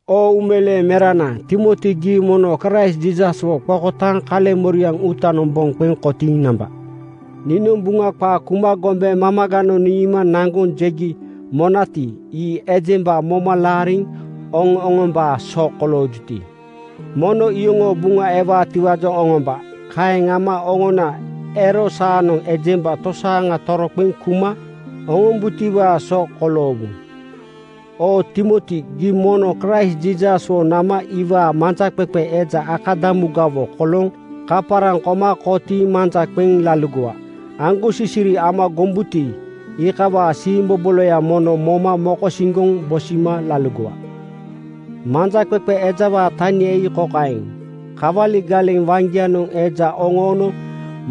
Oo uumeleeŋ merana Timoti, gii mono Kraist Jiisaswo qokotaaŋ kaleŋmoriaŋ uutanoŋ boŋ qeŋ kotiiŋ namba. Niinoŋ Buŋa qaa kuma gombe mamaganoŋ niima naŋgoŋ jegi monati, ii ejemba moma laariŋ oŋo-oŋombaa so koloojuti, mono iyoŋoo buŋa ewaatiwaajoŋ oŋomba. Kaeŋ ama oŋona ero saanoŋ ejemba tosaaŋa toroqeŋ kuma oŋombutiwaa so koloowu. Oo Timoti, gii mono Kraist Jiisaswo nama iwaa manjaqeqe eja akadamugawo kolooŋ kaparaŋ koma kotiiŋ manja qeŋ laligowa. Aŋgosisiri ama gombuti, iikawaa siimboboloya mono moma mokosiŋgoŋ bosima laligowa. Manjaqeqe ejawaa tania ii kokaeŋ: Kawali galeŋ waŋgianoŋ eja oŋoono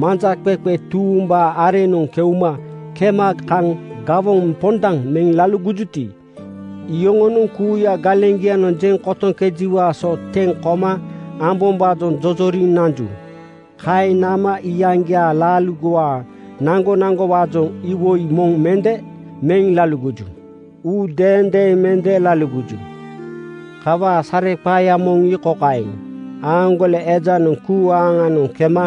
manjaqeqe tuumbaa areŋnoŋ keuma kema kaŋ gawoŋ pondaŋ meŋ laligojuti, iyoŋonoŋ kuuya galeŋgianoŋ jeŋ kotoŋkejiwaa so teŋ koma ambombaajoŋ jojoriŋ nanju. Kaeŋ nama iyaŋgiaa laaligowaa naŋgonaŋgowaajoŋ iwoi moŋ mende meŋ laligoju. Uu deendeeŋ mende laligoju. Kawaa sareqaaya moŋ ii kokaeŋ: Aaŋgole ejanoŋ kuu aaŋnoŋ keuma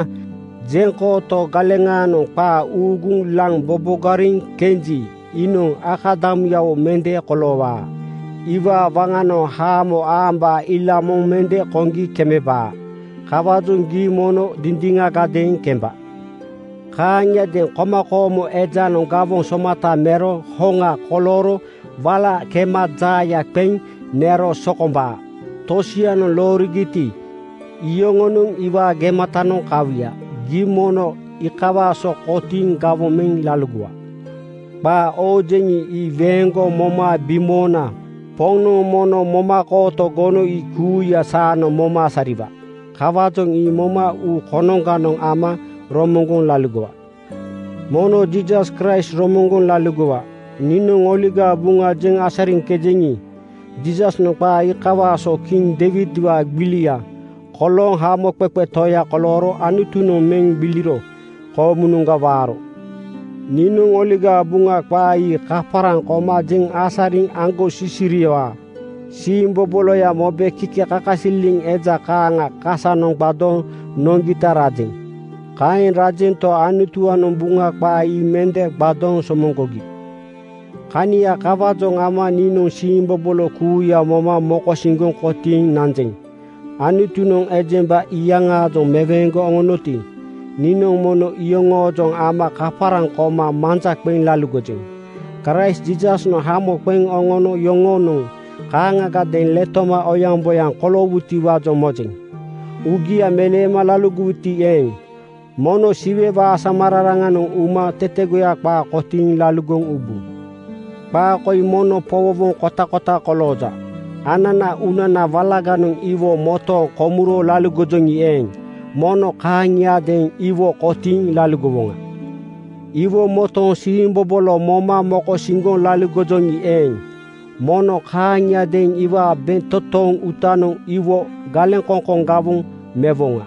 jeŋkooto galeŋaanoŋ qaa uuguŋ laŋ bobogariŋ kenji iinoŋ akadamuyawo mende koloowaa. Iwaa waŋanoŋ haamo aambaa ila moŋ mende koŋgi kemebaa. Kawaajoŋ gii mono dindiŋagadeeŋ kemba. Kaaŋiadeeŋ komakoomo ejanoŋ gawoŋ somata mero hoŋa kolooro wala kema jaaya qeŋ nero sokombaa. Tosianoŋ loorigiti, iyoŋonoŋ iwaa gematanoŋ kawuya. Gii mono iikawaa so kotiiŋ gawoŋ meŋ laligowa. Qaa oojeŋi, ii weeŋgoŋ moma bimoona Poŋnoŋ mono momakooto gono ii kuuya saanoŋ moma asariwa. Kawaajoŋ ii mono uu konoŋganoŋ ama romoŋgoŋ laligowa. Mono Jiisas Kraist romoŋgoŋ laligowa. Niinoŋ Oligaa Buŋa jeŋ asariŋkejeŋi, Jiisasnoŋ qaa iikawaa so kiŋ Deiwidwaa gbiliga kolooŋ Hamoqeqe Toya kolooro Anutunoŋ meŋ gbiliro koomunoŋga waaro. Niinoŋ Oligaa Buŋa qaa ii kaparaŋ koma jeŋ asariŋ aŋgosisiriwaa siimboboloya mobe kikekakasililiŋ eja kaaŋa kasanoŋ gbadooŋ noŋgita rajeŋ. Kaeŋ rajento, Anutuwaanoŋ Buŋa qaa ii mende gbadooŋ somoŋgogi. Kania kawaajoŋ ama niinoŋ siimbobolo kuuya moma mokosiŋgoŋ kotiiŋ nanjeŋ. Anutunoŋ ejemba iyaŋaajoŋ meweeŋgoŋ oŋonoti, niinoŋ mono iyoŋoojoŋ ama kaparaŋ koma manja qeŋ laligojeŋ. Kraist Jiisasnoŋ hamo qeŋ oŋono yoŋonoŋ kaaŋagadeeŋ letoma oyaŋboyaŋ koloowutiwaajoŋ mojeŋ. Uugia meleema laligowuti eeŋ, mono Siwewaa asamararanoŋ uma tetegoya qaa kotiiŋ laligoŋ ubu. Qaa koi mono powowoŋ kotakota kolooja: “Anana uunana walaganoŋ iwo motooŋ komuro laligojoŋi eeŋ, mono kaaŋiadeeŋ iwo kotiiŋ laligowoŋa. Iwo motooŋ siimbobolo moma mokosiŋgoŋ laligojoŋi eeŋ, mono kaaŋiadeeŋ iwaa bentotoŋ uutanoŋ iwo galeŋkoŋkoŋ gawoŋ mewoŋa.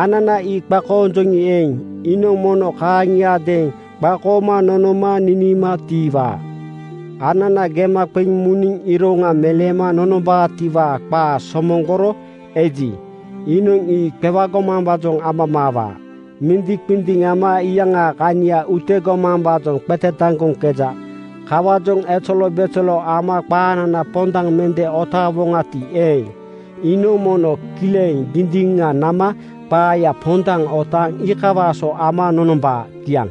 Anana ii qakoonjoŋi eeŋ, iinoŋ mono kaaŋiadeeŋ qakooma nonoma niniima tiiwaa. Anana gema qeŋ muniŋ iroŋa meleema nonombaatiwaa qaa somoŋgoro eji, iinoŋ ii qewagomambaajoŋ amamaawaa. Mindiŋqindiŋ ama iyaŋaa kania utegomambaajoŋ qetetaŋgoŋkeja. Kawaajoŋ ezelobezelo ama qaanana pondaŋ mende otaawoŋati eeŋ, iinoŋ mono kileŋ (dindiŋa nama) qaaya pondaŋ otaaŋ iikawaa so ama nonombaa.” Kiaŋ.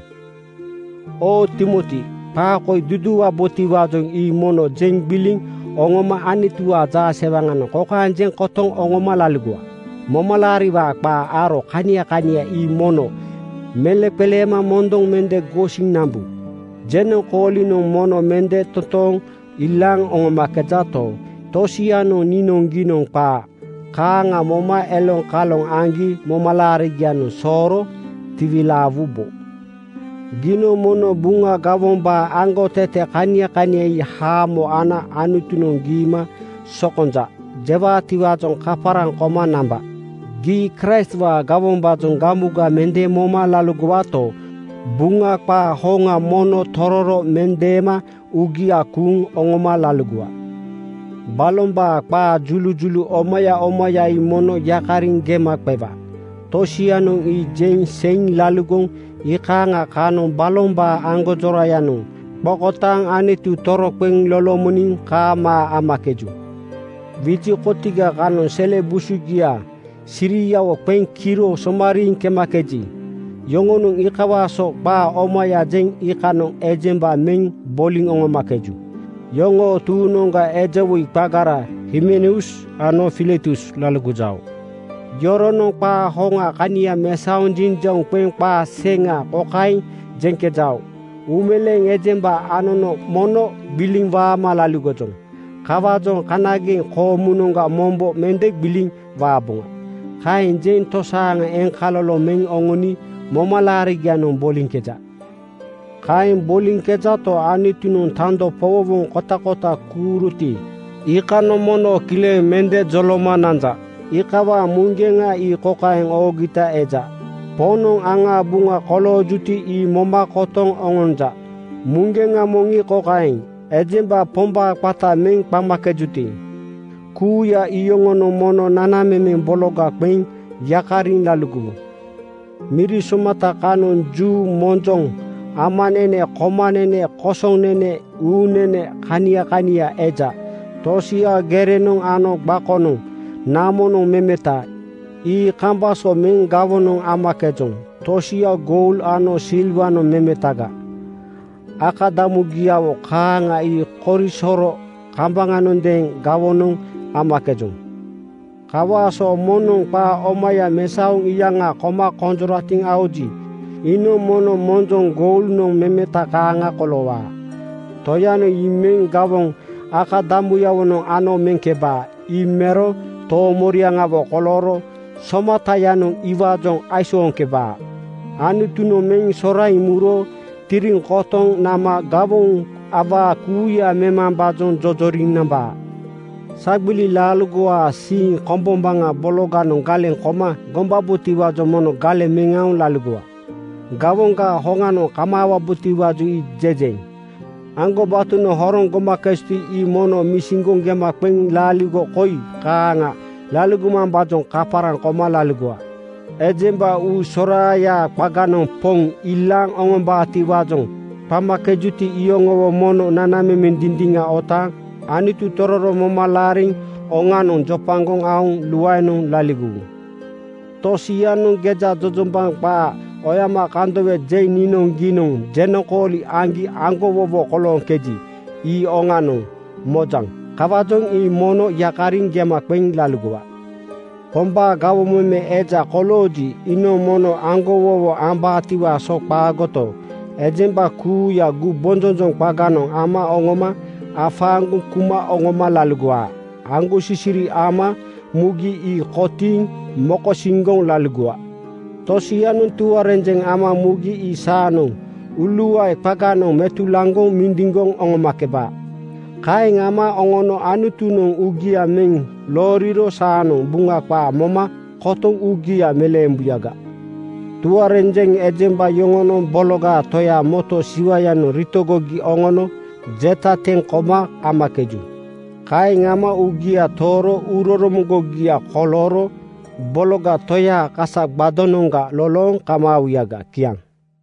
Oo Timoti, qaa koi duduuwabotiwaajoŋ ii mono jeŋ gbiliŋ oŋoma Anutuwaa jaasewaŋanoŋ kokaeŋ jeŋ kotoŋ oŋoma laligowa: Momalaariwaa qaa aro kania kania ii mono meleŋqeleema mondoŋ mende gosiŋ nambu. Jenoŋkoolinoŋ mono mende totooŋ ilaaŋ nonomakejato, tosianoŋ niinoŋgiinoŋ qaa kaaŋa moma eloŋkaloŋ aŋgi momalaarigianoŋ sooro tiwilaawubo. Giinoŋ mono Buŋa gawombaa aŋgotete kania kania ii haamo ana Anutunoŋ giima “Sokonjaŋ,” jewaatiwaajoŋ kaparaŋ koma namba. Gii Kraistwaa gawombaajoŋ gamuga mende moma laligowato, Buŋa qaa hoŋa mono tororo mendeema uugia kuuŋ oŋoma laligowa. Balombaa qaa julujulu omaya omaya ii mono yakariŋ gema qewa. Tosianoŋ ii jeŋ seiŋ laligoŋ iikaaŋa kanoŋ balombaa aŋgonjorayanoŋ qokotaaŋ Anutu toroqeŋ lolomoniŋ kaamaa amakeju. Wiji kotiga (qata kensa) kanoŋ sele busugia siriawo qeŋ kiro somariiŋ kemakeji, yoŋonoŋ iikawaa so qaa omaya jeŋ iikanoŋ ejemba meŋ boliŋ oŋomakeju. Yoŋoo tuuŋnoŋga eja woi qagara Himeneus ano Filetus laligojao. Yoronoŋ qaa hoŋaa kania mesaoŋ jinjauŋ qeŋ qaa seŋa kokaeŋ jeŋkejao, “Uumeleeŋ ejemba anono mono gbiliŋ waama laligojoŋ. Kawaajoŋ kanageŋ koomunoŋga mombo mende gbiliŋ waaboŋa.” Kaeŋ jeŋ tosaaŋa eŋkaloloŋ meŋ oŋoni momalaarigianoŋ boliŋkeja. Kaeŋ boliŋkejato, Anutunoŋ tando powowoŋ kotakota kuuroti iikanoŋ mono kileŋ mende joloma nanja. Iikawaa muŋgeŋa ii kokaeŋ oogita eja, “Poŋnoŋ aŋaa buŋa koloojuti ii moma kotoŋ oŋonja.” Muŋgeŋa moŋ ii kokaeŋ, “Ejemba Pombaa qata meŋ qamakejuti, kuuya iyoŋonoŋ mono nanamemeŋ bologa qeŋ yakariŋ laligowu.” Miri somata kanoŋ juu, monjoŋ, amanene, komanene, kosonene, uunene kania kania eja. Tosia gerenoŋ ano gbakoŋ namonoŋ memeta, ii kambaŋ so meŋ gawonoŋ amakejoŋ. Tosia goul ano silwanoŋ memetaga. Akadamugiawo kaaŋa ii korisoro kambaŋanondeeŋ gawonoŋ amakejoŋ. Kawaa so moŋnoŋ qaa omaya mesaoŋ iyaŋa koma konjoratiŋ aoji, iinoŋ mono monjoŋ goulnoŋ memeta kaaŋa koloowaa. Toyanoŋ ii meŋ gawoŋ akadamuyawonoŋ ano meŋkebaa. Ii mero toomoriaŋawo kolooro Somatayanoŋ iwaajoŋ aisooŋkebaa. Anutunoŋ meŋ soraiŋ muro tiriŋ kotoŋ nama gawoŋ awaa kuuya memambaajoŋ jojoriŋ nambaa. Sagbili laaligowaa siiŋ kombombaŋa bologanoŋ galeŋ koma gombabotiwaajoŋ mono galeŋ meŋ aoŋ laligowa. (Gawoŋgaa hoŋanoŋ kamaawabotiwaajoŋ ii jejeŋ.) Aŋgobatonoŋ horoŋ gomakejuti, ii mono misiŋgoŋ gema qeŋ laaligo koi kaaŋa laligomambaajoŋ kaparaŋ koma laligowa: Ejemba uu soraayaa qaganoŋ Poŋ ilaaŋ oŋombaatiwaajoŋ qamakejuti iyoŋowo mono nanamemeŋ dindiŋa otaaŋ Anutu tororo moma laariŋ oŋanoŋ jopagoŋ aoŋ luaenoŋ laligowu. Tosianoŋ gejajojombaŋ qaa oyomakandowe jeŋ niinoŋgiinoŋ jenoŋkooli aŋgi aŋgowowo kolooŋkeji, ii oŋanoŋ mojaŋ. Kawaajoŋ ii mono yakariŋ gema qeŋ laligowa. Pombaa gawoŋ meme eja kolooji, iinoŋ mono aŋgowowo ambaatiwaa so qaagoto, ejemba kuuya gumbonjonjoŋ qaganoŋ ama oŋoma afaaŋgoŋ kuma oŋoma laligowa. Aŋgosisiri ama mugi ii kotiiŋ mokosiŋgoŋ laligowa. Tosianoŋ tuarenjeŋ ama mugi ii saanoŋ uuluae qaganoŋ metulaŋgoŋ mindiŋgoŋ oŋomakeba. Kaeŋ ama oŋono Anutunoŋ uugia meŋ looriro saanoŋ Buŋa qaa moma kotoŋ uugia meleembuyaga. Tuarenjeŋ ejemba yoŋonoŋ Bologa Toyaa moto siwanoŋ ritogogi oŋono jeta teŋ koma amakeju. Kaeŋ ama uugia tooro uuroromoŋgogia kolooro Bologa Toyaa kasa gbadonoŋga lolooŋ kamaawuyaga. Kiaŋ.